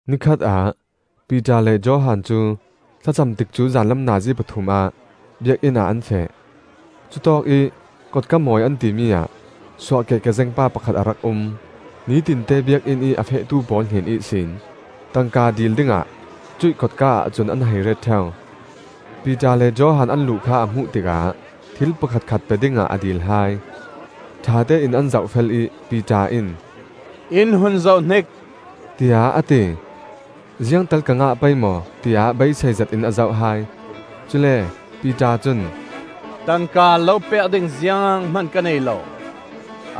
Nikhat ah Piter le Johan cu thlacam tikcu zanlam nazi pathum ah Biakinn ah an feh. Cutawkih Kotka Mawi an timi ah suahkeh kezeng pa pakhat a rak um. Nitinte Biakinn ih a fehtu pawl hnen ihsin tangka dil dingah cuih kotka-ah cun an hei ret ṭheu. Piter le Johan an luh kha a hmuh tikah thil pakhatkhat pe dingah a dil hai. Ṭhatein an zoh fel ih Piter in, “In hun zohhnik!” tiah a ti. Ziangtal ka ngah pei maw, tiah beisei zetin a zoh hai. Cule Piter cun, “Tangka lo pek ding zianghman ka nei lo;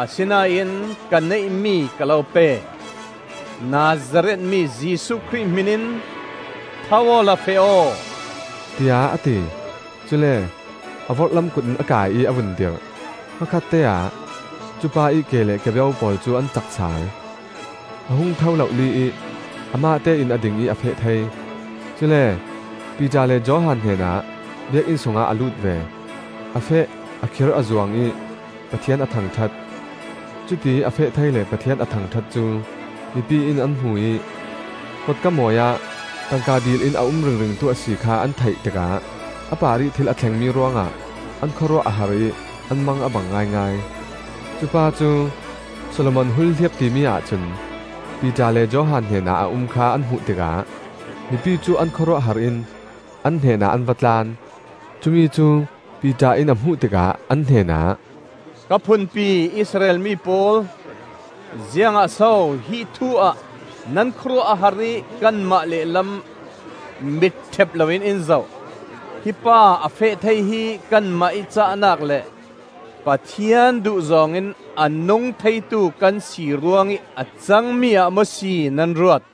asinain ka neihmi ka lo pe: Nazareth mi Jesuh Khrih hmin in tho awla feh aw,” tiah a ti. Cule a vorhlam kut in a kaih ih a vun dirh. Hmakhatteah cupa ih ke le kebeu pawl cu an cak sal. A hung tho lohli ih amahte in a ding ih a feh thei. Cule Piter le Johan hnenah Biakinn sungah a lut ve. A feh, a khir a zuang ih Pathian a thangṭhat. Cutiih a feh thei le Pathian a thangṭhat cu mipi in an hmu ih, Kotka Mawi ah tangka dil in a um ringringtu a si kha an theih tikah a parih thil a thlengmi ruangah an khawruah a har ih an mang a bang ngaingai. Cupa cu Solomon Hulhliap timi ahcun Piter le Johan hnenah a um kha an hmuh tikah mipi cu an khawruahhar in an hnenah an va tlan. Cumi cu Piter in a hmuh tikah an hnenah, “Ka phunpi Israel mi pawl, ziangah so hi thu ah nan khawruah a har ih kanmah lehlam mitṭhep loin in zoh? Hi pa a feh thei hi kanmah ih cahnak le Pathian duhzawng in a nung theitu kan si ruangih a cangmi ah maw si nan ruat?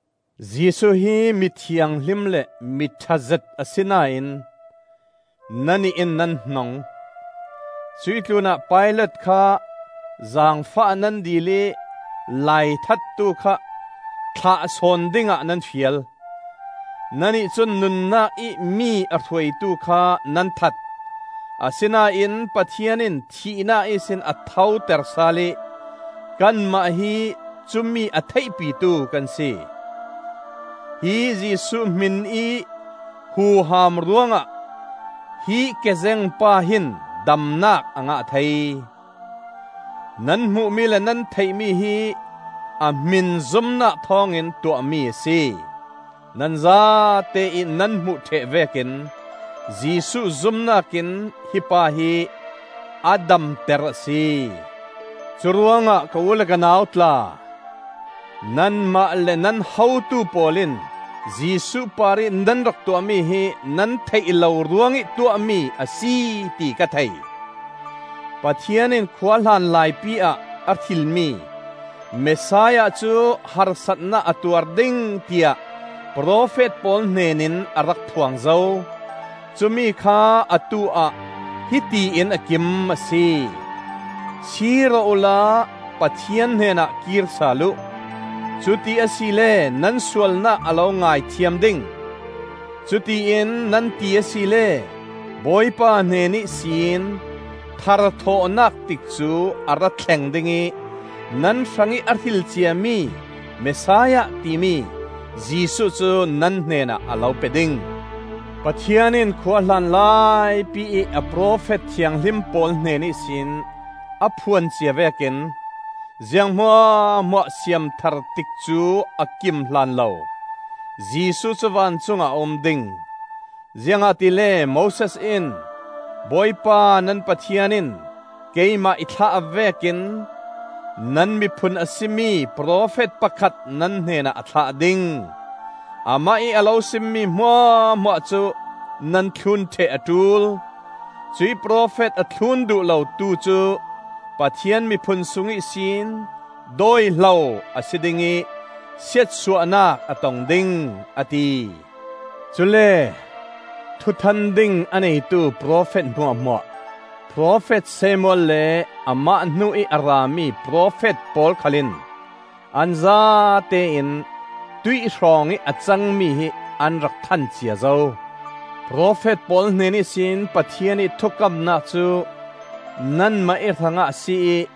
Jesuh hi mi thianghlim le mi ṭhazet asinain nannih in nan hnong; cuih tlunah Pilat kha zaangfah nan dil ih laithattu kha thlah sawn dingah nan fial. Nannih cun nunnak ih mi a hruaitu kha nan that; asinain Pathian in thihnak ihsin a thoter sal ih kanmah hi cumi a theihpitu kan si. Hi Jesuh hminih huham ruangah hi kezeng pa hin damnak a ngah thei. Nan hmuhmi le nan theihmi hi a hmin zumnak thawngin tuahmi a si. Nan zate ih nan hmuh ṭheh vekin Jesuh zumnak in hi pa hi a damter a si. Curuangah ka u le ka nau tla, nanmah le nan hotu pawl in Jesuh parih nan rak tuahmi hi nan theih lo ruangih tuahmi a si ti ka thei. Pathian in khuahlan laipi ah a hrilmi Messiah cu harsatnak a tuar ding tiah profet pawl hnenin a rak phuang zo; cumi kha atu-ah hiti in a kim a si. Sir aw uhla Pathian hnenah kir sal uh. Cuti asile nan sualnak a lo ngaithiam ding. Cutiin nan ti asile, Bawipa hnen ihsin tharthawhnak tikcu a rathleng ding ih nan hrangih a hrilcia mi Messiah timi Jesuh cu nan hnenah a lo pe ding. Pathian in khuahlan laipi ih a profet thianghlim pawl hnen ihsin a phuan cia vekin, ziang hmuahhmuah siam thar tikcu a kim hlanlo Jesuh cu vancungah a um ding. Ziangahtile Moses in, ‘Bawipa nan Pathian in keimah i thlah vekin nan miphun a si mi profet pakhat nan hnenah a thlah ding. Amah ih a lo simmi hmuahhmuah cu nan thlun ṭheh a ṭul. Cuih profet a thlun duh lotu cu Pathian miphun sung ihsin dawihlo a si ding ih siatsuahnak a tong ding,’ a ti. Cule thuthan ding a neitu profet hmuahhmuah, profet Samuel le amah hnu ih a rami profet pawl khal in, an zatein tuih hrawngih a cangmi hi an rak than cia zo. Profet pawl hnen ihsin Pathian ih thukamnak cu nanmah ih hrangah a si ih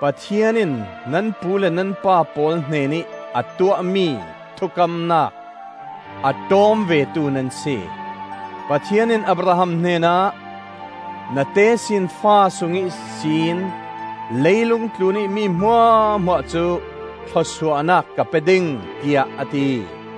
Pathian in nan pu le nan pa pawl hnenih a tuahmi thukamnak a ṭawm vetu nan si. Pathian in Abraham hnenah, ‘Na tesinfa sung ihsin leilung tlunih mi hmuahhmuah cu thluasuahnak ka pe ding,’ tiah a ti.